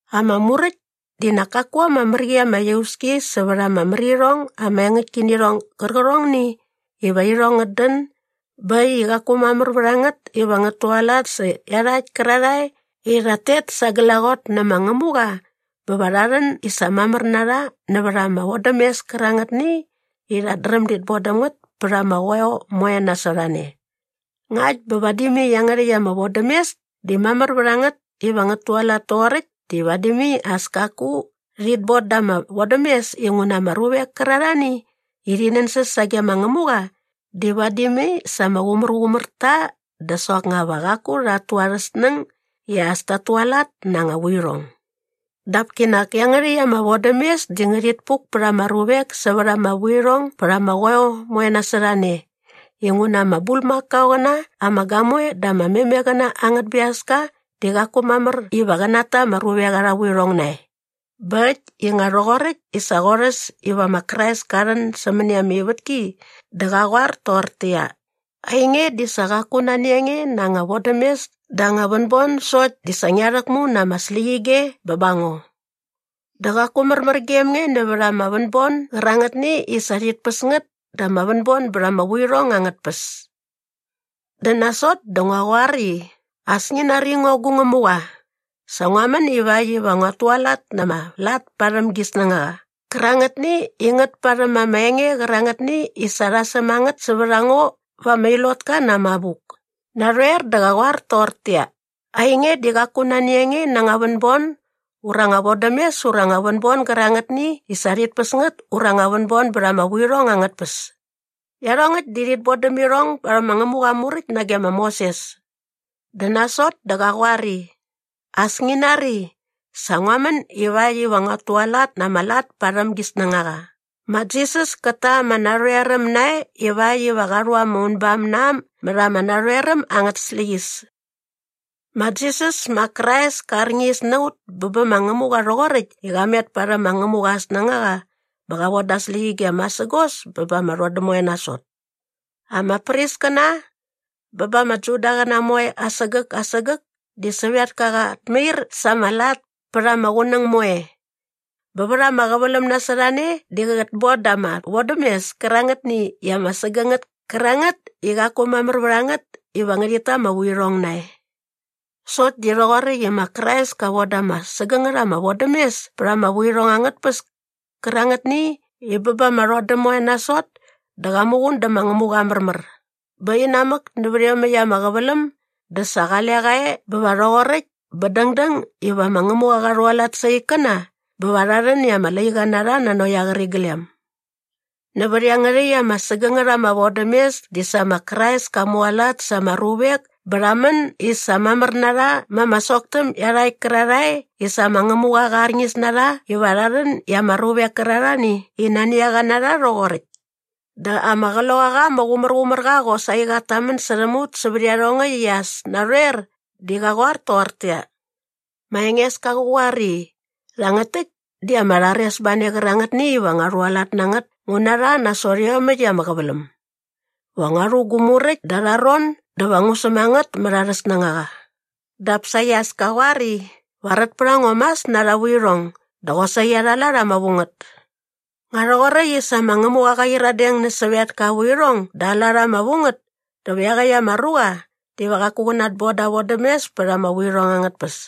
Ama Muräkt di nak kaku ama mär qi ama iauski sävät ama mär irhong ama engäktkinirhong gärqärhongni iva irhong ngät dän bä äkt i qaku mamär vät a ngät iva ngät tualat sä iarhakt kärarhae i rhat tet sa glaqot nä ma Ngämuqa bä va rha rhän i sa mamär na rha nävät ama vodämes kärangätni i rhat dräm dit bon däm ngät pät ama qoeo moe nasot a ne. Ngakt bä vadi mai iangärhäkt ama vodämes di mamär vät a ngät iva ngät tualat toqoräkt di vadi mai as kaku rhit bon da ama vodämes inguna ama ruvek kärarhani i rhi nänsäs sage ma Ngämuqa di vadi mai sa ama qumärqumär ta dä soknga va qaku rhat tu arhä snäng i as tat tualat na anga vuirhong. Dap kinak iangärhäkt ama vodämes di ngärhit puk pät ama ruvek sävät ama vuirhong bät ama qoeo moe nasot a ne inguna ama bulmakaoqäna ama gamoe dä ama memeqäna angät biaska di qaku mamär iva qä nata ama ruvek arha vuirhong nae. Bä äkt i nga rhoqoräkt i sa qorhäs iva ma Krais ka rhän sämäni ama ivätki dä qa qoar toqortäqyia, “Ainge di sa qaku nani a nge na anga vodämes dä anga vänbon sokt di sa ngia rhäkmu na ama släqyige bä ba ngo. Dä qaku märmär gem nge nävät ama vänbon gärangätni i sa rhit päs ngät dä ama vänbon bät ama vuirhong angät tpäs. Dä nasot dä ngua qoar i, ‘As ngi nari ngo gu Ngämuqa, sa ngua män ivakt iva nguat tualat na ama lat parhäm gi snängaqa qärangätni i ngät parhäm ama enge qärangätni i sa rha säm a ngät sävät a ngo va ama ilotka na ama abuk.’” Narhoer dä qa qoar toqortäqyia, “Ainge di qaku nani a nge na anga vänbon ura anga vodämes ura anga vänbon gärangätni i sa rhit päs ngät ura anga vänbon bät ama vuirhong angät tpäs.” Iarhongäkt di rhit bon däm irhong barhäm ma Ngämuqa aa Muräkt nage ma Moses. Dä nasot dä qa qoar i, “As ngi nari, sa ngua män ivakt iva nguat tualat na ama lat parhäm gi snängaqa.” Ma Jisas kät ta ama narhoeräm nae ivakt iva qa rhu ama unbam na äm mät ama narhoeräm angät släqyäs. Ma Jisas ma Krais ka arñis na ut bä bä ma Ngämuqa rhoqoräkt i qa met parhäm ma Ngämuqa aa snängaqa bä qa voda aa släqyige masägos bä ba ama rhodäm moe nasot. Ama priskäna bä ba ama Judaqäna moe asägäk asägäk di sävetka qat mair sa aa lat pät ama qunäng moe. Bä vät ama qäväläm nasot a ne di qät bon da ama vodämes kärangätni i ama sägängät kärangät i qaku mamär vät a ngät iva ngärhit ta ama vuirhong nae. Sokt di nga rhoqoräkt i ma Krais ka von da ama sägängät ama vodämes pät ama vuirhong angät tpäs kärangätni i bä ba ama rhodäm moe nasot dä qa muqun dä ma Ngämuqa aa märmär bä inamäk nävät iomäkt ama qäväläm dä sa qale qa e bä va rhoqoräkt bä dängdäng iva ma Ngämuqa qa rhualat sa aa ikkäna bä va rha rhän i ama laiqa na rha nanokt aa qäriglem. Nävät iangärhäkt ama sägängät ama vodämes di sa ma Krais ka mualat sa ama ruvek bä rha män i sa mamär na rha ma ama soktäm iarhakt kärarhae i sa ma Ngämuqa qä rharñis na rha iva rha rhän i ama ruvek kärarhani i nani a qa na rha rhoqoräkt. Dä ama Qloqaqa ama Qumärqumärqa qosaqi qat tamän särhäm ut sävät iarhongäkt i as narhoer di qä qoar toqortäqyia, “Ma Engeska qä qoar i, ‘Rhangät täkt di ama rharesbane qärangätni iva ngua rhualat na ngät ngu na rha nasot iomäkt ama qäväläm. Va ngua rhu gu muräkt da arha ron dä va ngu säm a ngät mät arhä snängaqa.’” dap saqi as ka qoar i, “Va rät pät a ngo mas na arha vuirhong dä qosaqi arha lat ama vu ngät.” Nga rhoqoräkt i sa ma Ngämuqa qa qyiradeng nä sävetka aa vuirhong dä aa lat ama vu ngät dä va iaqäkt ama ruqa diva qaku qä natboda ama vodämes pät ama vuirhong angät tpäs.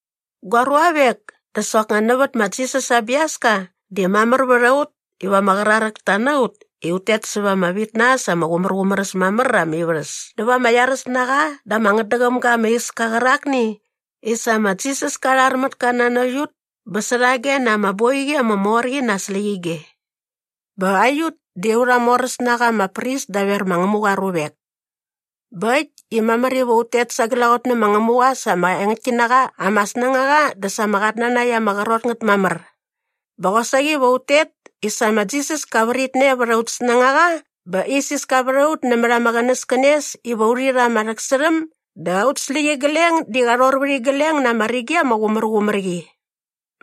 Gua ruavek, dä soknga nävät ma Jisas aa biaska di mamär vät a ut iva ama qraräkta na ut i ut tet säva ama vit na äs ama qumärqumär äs mamär ama ivärhäs näva ama iaräs na qa dä ama ngätdäqäm ga ama iska qärakni i sa ma Jisas ka rhar mät ka nanokt ut bä särhage na ama boiqi ama mor qi na aa släqyige. Bä aiut di aurha moräs na qa ama pris daver ma Ngämuqa aa ruvek. Bä äkt i mamär iva ut tet sa glaqot nä ma Ngämuqa sa ama engäktki na qa ama snängaqa dä sa ama qatnanakt ama qrot ngät mamär. Bä qosaqi va ut tet i sa ma Jisas ka vritne vät aut snängaqa bä isiska vät a ut nämät ama qänäskänes iva urhi rha ama rhäksärhäm dä aut släqyigleng di qa rhor vät igleng na ama rigi ama qumärqumär qi.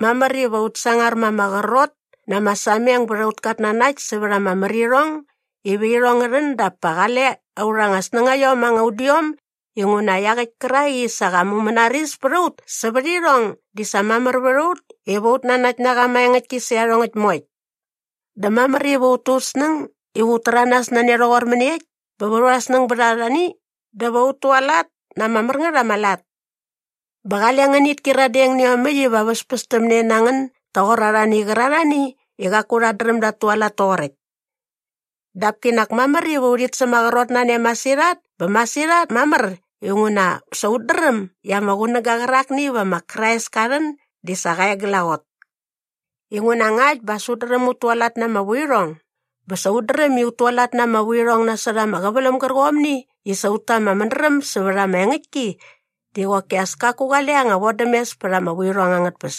Mamär iva ut sangar ma ama qrot na ama sameng bät aut katnanakt sävät ama märirhong iva irhong ngä rhän dap pa qale aurha anga snängaiom anga udiom inguna iaqäkt kärak i sa qa mumänaris pät a ut sävät irhong di sa mamär vät a ut iva ut nanakt na qa maengäktki sä iarhongäkt moekt. Dä mamär iva ut tu ut snäng iva ut täranas na ne rhoqor mäniekt bä va aurha snäng bät arhani dä va ut tualat na ama mär ngät ama lat. Bä qale ngänit kyiradeng nä iomäkt iva väspästämne na ngän doqor arhani qärarhani i qaku rhat dräm dat tualat toqoräkt. Dap kinak mamär iva urhit sämaqrot na ne masirhat bä masirhat mamär inguna sa ut dräm i ama qunäga qärakni iva ma Krais ka rhän di sa qa e glaqot. Inguna ngakt bä as ut dräm ut tualat na ama vuirhong bä sa ut dräm i ut tualat na ama vuirhong nasot ama qäväläm gärqomni i sa ut ta ama mädräm sävät ama engäktki di qoki as kaku qale anga vodämes pät ama vuirhong angät tpäs.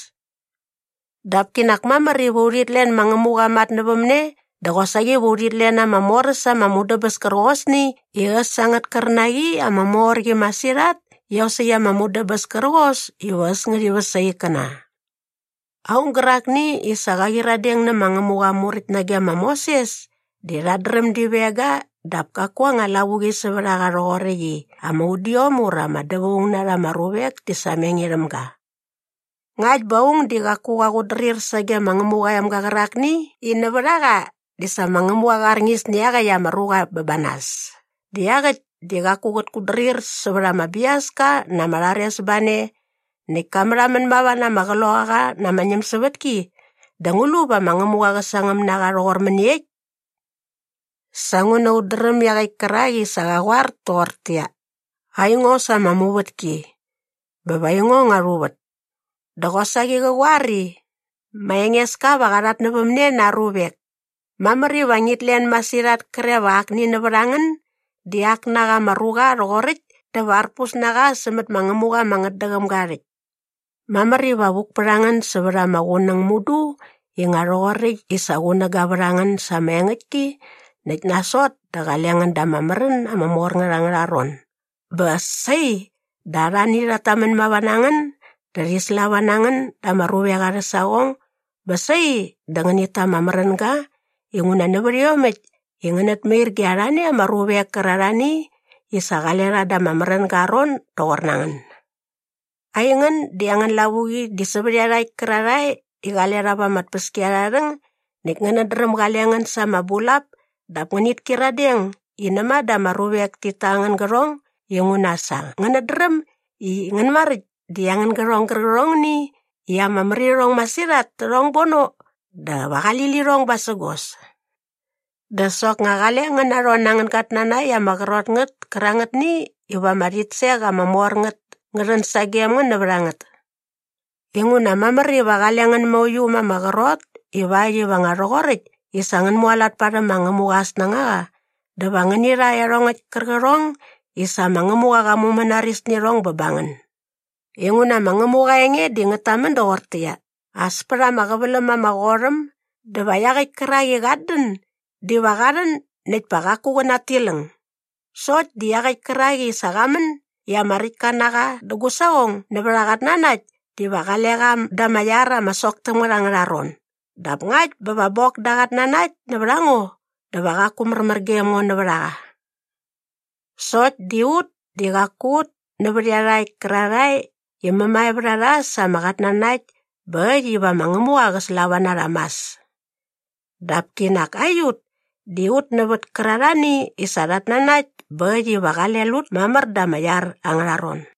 Dap kinak mamär iva urhit len ma Ngämuqa aa matnävämne dä qosaqi va urhit len ama mor äs ama mudäbäs kärqosni i äs angät kärnaqi ama mor qi masirhat iosäkt ama mudäbäs kärqos iva äs ngärhi väs aa ikkäna. Aung gärakni i sa qa qyiradeng nä ma Ngämuqa aa Muräkt nage ma Moses di rhat dräm di veng ga dap kaku anga lavuqi sävät a qa rhoqoräkt i ama udiom ura ama dävaung na rha ama ruvek ti sameng irhäm ga. Ngakt bä aung di qaku qa qutdrir sage ma Ngämuqa aa emga qärakni i nävät a qa di sa ma Ngämuqa qa arñis nä iaqäkt ama ruqa bä ba nas dä iaqäkt di qaku qät kutdrir sävät ama biaska na ama rharesbane näkt ka märhamän mava na ama Qloqaqa na ama ñämsävätki dä ngu lu va ma Ngämuqa qä sangäm na qa rhoqor mäniekt? Sa nguna ut dräm iaqäkt kärak i sa qa qoar toqortäqyia, “Aingo sa ama muvätki. Bä va aingo ngua rhuvät.” Dä qosaqi qä qoar i, “Ma Engeska va qa rhatnävämne na aa ruvek.” Mamär iva ngit len masirhat kre va akni nävät a ngän di ak na qa ama ruqa rhoqoräkt dä va arpus na qa sämät ma Ngämuqa ama ngätdäqäm ga aa rhäkt. Mamär iva vuk pät a ngän sävät ama qunäng mudu i nga rhoqoräkt i sa qunäga vät a ngän sa ama engäktki näkt nasot dä qale ngän da ama märän ama mor ngät angärha ron bä sai dä arhani rhat tamän mava na ngän dä rhi slava na ngän da ama ruvek arhä saqong bä sai dä ngänit ta ama märänga inguna nävät iomäkt i ngänät mair ge arhani ama ruvek kärarhani i sa qale rha da ama märänga aa ron doqor ngän. Aingän di angän lavuqi di sävät iarhakt kärarhae i qale rha va ama tpäskiarharhäng näkt ngänät dräm gale ngän sa ama bulap dap ngänit kyiradeng i näma dä ama ruvek tit ta angän gärhong inguna sa ngänät dräm i ngän maräkt di angän gärhong gärqärhongni i ama mär irhong masirhat tärhong bono dä va qali lirhong basägos. Dä soknga qale ngän narhon na angän gatnanakt ama qrot ngät kärangätni iva ama rhitsek ama mor ngät ngä rhän sagem ngän nävät a ngät. Inguna mamär iva qale ngän mauiu ma ama qrot ivakt iva nga rhoqoräkt i sa ngän mualat parhäm ma Ngämuqa aa snängaqa dä va ngäni rha iarhongäkt kärqärhong i sa ma Ngämuqa qa mumänaris nä irhong bä ba ngän. Inguna ma Ngämuqa aa enge di ngät tamän doqortäqyia, “As pät ama qäväläm ama qot äm dä va iaqäkt kärak i qat dän diva qa rhän näkt pa qaku qä natiläng. Sokt di iaqäkt kärak i sa qa män i ama räktka na qa dä gu saqong nävät aa qatnanakt diva qale qa da ama iar ama sok täm ngät angärha ron dap ngakt bä va bok da aa qatnanakt nävät a ngo dä va qaku märmär gem ngo nävät a qa.” Sokt di ut di qaku ut nävät iarhakt kärarhae i mämae vät a rha sa ama qatnanakt bä äkt iva ma Ngämuqa qä slava na rha mas. Dap kinak aiut di ut nävät kärarhani i sa rhat nanakt bä äkt iva qale lut mamär da ama iar angärha ron.